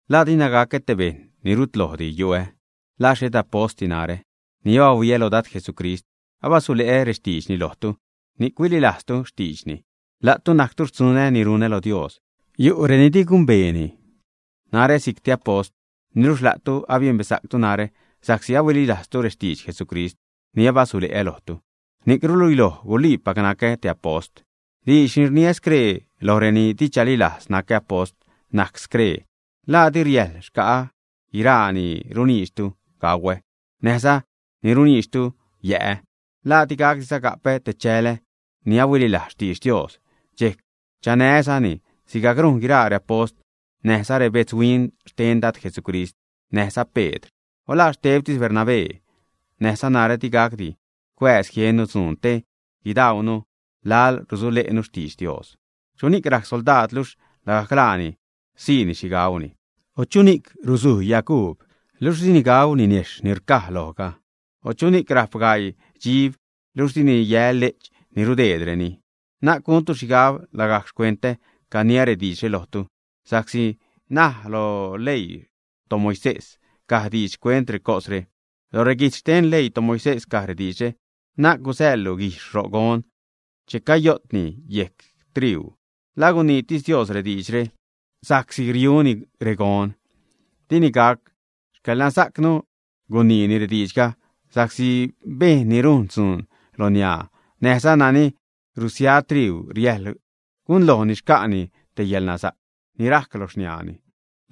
¿La dina gacä te bejṉ ni rut lojdi yu'ä? ¿La xhet apostdi narä? Ni abahuiä lo Dad Jesucrist, abasule'ä rextiidxni lojtu, ni'c huililajztu xtiidxni. La'tu najctu xtzunä ni runä lo Dios. Yu' reni di gumbeeni narä si'c te apost, niluxh la'tu abiembesa'ctu narä sa'csi ahuililajztu rextidx Jesucrist ni abasule'ä lojtu. Ni'c ruluiloj guliipac nacä te apost. Diidx ni rniä scree loj reni di chalilajz nacä apost najc scree: ¿La di riäjl xca'ä guiraa ni runiidxtu gauä näjza ni runiidxtu yä'ä? ¿La digacdiza gapä te chälä ni ahuililajz xtidx Dios dxejc chanää́zani sigajc rujn guiraa reapost, näjza rebetzhuin xten Dad Jesucrist näjza Pedr? O ¿la xtebtis Bernabé näjza narä di gacdi cuääz jiennu dzuun te guidaunu laḻ rusule'nu xtidx Dios? ¿Chuni'c rajc soldaad luxh lagajc laani siini xhi gauni? O ¿chuni'c rusuj yaguub luxh dini gau ninejxh ni rcaj lojga, ä? O ¿chuni'c rajp gaii dxib, luxh dini yä le'ch ni rudeedreni, ä? Na'c guntu xhigab lagajc xcuentä caniä rediidxre lojtu, sa'csi näj loj xleii toMoisés caj diidx xcuent recosre. Loj reguijtz xten xleii toMoisés caj rediidxre: “Na'c gusäḻlu guijxh ro' gon che cayo'tni yejc triuu.” ¿La guniitis Dios rediidxre sa'csi riuni regon, ä? ¡Dini gac! Xcäḻnasa'cnu guniini rediidxga, sa'csi bejṉ ni rujn dzuun lo niaa näjza nani rusia triuu riäjḻ gunlojni xca'ni te yälnasa'c ni rajc lo xniaani.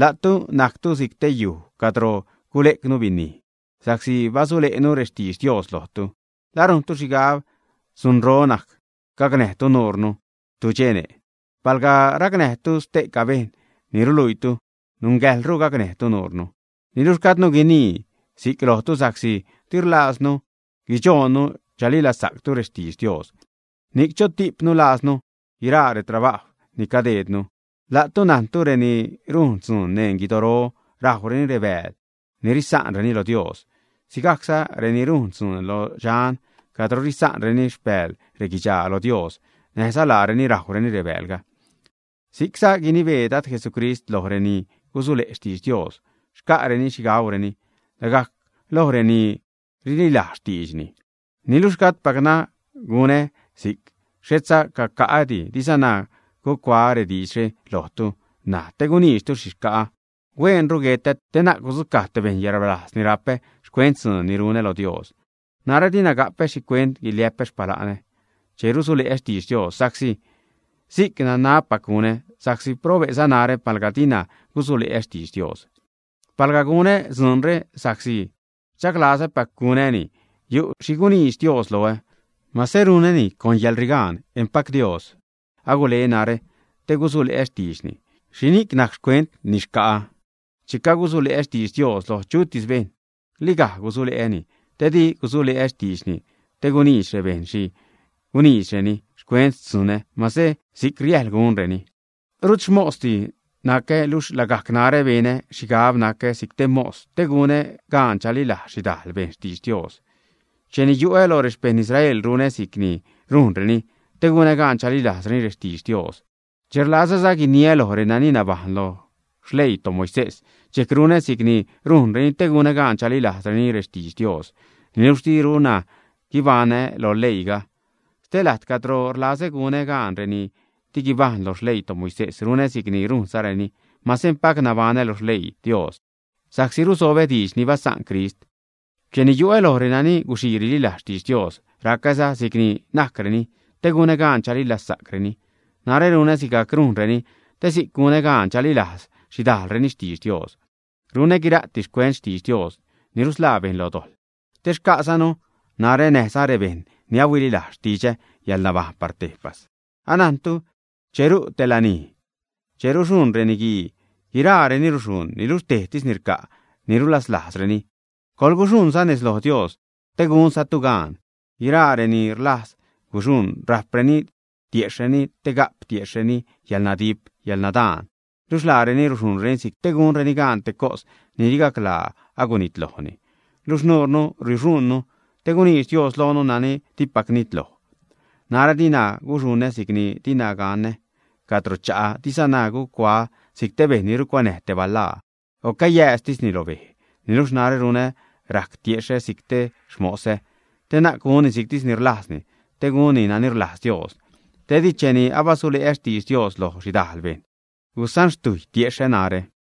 La'tu najctu si'c te yuj cadro gule'cnu binij sa'csi basule'nu rextidx Dios lojtu, ¿la rujntu xhigab dzunro najc gacnäjtu nuurnu tudxene', ä? Palga racnäjtu ste'ca bejṉ ni ruluiitu, nungäjḻru gacnäjtu nuurnu. Niluxh gajdnu guinii si'c lojtu sa'csi di rlajzdinu guidxoonnu chalilazsa'ctu rextidx Dios, ni'c chotipnu lajznu guiraa retrabajw ni cadeednu. La'tu najntu reni rujn dzuun neṉ guidoro rajwreni rebääl ni risa'nreni lo Dios, sigajcza reni rujn dzuun lo dxan cadro risa'nreni xpääl reguidxaa lo Dios, näjza laareni rajwreni rebäälga. Si'cza gunibee Dad Jesucrist loj reni gusule' xtidx Dios, xca'reni xhi gaureni lagajc loj reni rililajz xtiidxni. Niluxh gajdpacna gunä si'c, xhetza caca'ädi. Dizana gucuaä rediidxre lojtu ṉaj te guniidxtu xhi xca'a. Hueenru guetä te na'c gudzucaj te bejṉ yäḻrbalajz ni rapä xcuent dzuun ni runä lo Dios. Narä dina gapä xhicuent guiliä'pä xpala'nä che rusule'ä xtidx Dios. Sa'csi si'c nanabpac gunä, sa'csi probe'za narä palga dina gusule'ä xtidx Dios. Palga gunä dzuunre sa'csi rdxaglazäpac gunäni yu' xhi guniidx Dios loä. Mase runäni con yäḻrigaan, empac Dios agule narä te gusule'ä xtiidxni. ¿Xhini'c najc xcuent ni xca'ä, ä? Che gusule'ä xtidx Dios lo chutis bejṉ, ligaj gusule'äni, te di gusule'ä xtiidxni te guniidx rebejṉ xhi guniidxreni xcuent xtzunä, mase si'c riäjl gunreni. Rut xmosdi nacä, luxh lagajc narä benä xhigab gacä si'c te mos te gunä gaan chalilajz xhidajl bejṉ xtidx Dios. Cheni yu'ä loj rexpejṉ Israel, runä si'cni rujnreni te gunä gaan chalilajzreni rextidx Dios. Che rlazäza guiniä loj reni nabajṉ loj xleii toMoisés, dxejc runä si'c rujnreni te gunä gaan chalilajzreni rextidx Dios, niluxh diruna guibaṉä lo leiiga. Stee lajt cadro rlazä gunä gaan reni di guibajṉ lo xleii toMoisés, runä si'c rujnzareni, mase empac nabaṉä lo xleii Dios sa'csi rusobä diidxni basa'n Crist. Cheni yu'ä loj reni guxii rililajz xtidx Dios, racäza si'c ni najcreni te gunä gaan chalilazsa'creni. Narä runä sigajc rujnreni, te si'c gunä gaan chalilajz xhidajlreni xtidx Dios. Runä guira'ti xcuent xtidx Dios ni rusḻaa bejṉ lo dojḻ, te xca'zanu, narä näjza rebejṉ ni ahuililajz xtidxä, yäḻnabajṉ par tejpas. Anajntu che ru' te lanij, che ruxuṉ reniguii, guiraareni ruxuṉ, niluxh tejtis ni rca' ni ruzalajzreni. Coḻguxuṉza nez lo Dios te gunzatu gaan. Guiraa reni rlajz guxuṉ rapdareni tiejxhreni te ga'p tiejxhreni yäḻnadip, yäḻnadaan. Luxh laareni ruxuṉreni si'c te gunreni gaan te cos ni di gaclaa agunitlojni. Niluxh nuurnu ruxuṉnu te guniidx Dios loonu nani dipac nitloj. Narä dina guxuṉä si'cni dina ganä caro cha'ä, dizana gucuaä si'c te bejṉ ni rucuanäj te balaa, o cayääztisni lo bej. Niluxh narä runä rajc tiexhä si'c xmosä te na'c gunni si'ctis ni rlajzni, te gunni nani rlajz Dios te di cheni abasule'ä xtidx Dios loj xhidajl bejṉ, gusanxtujy tiexhä narä.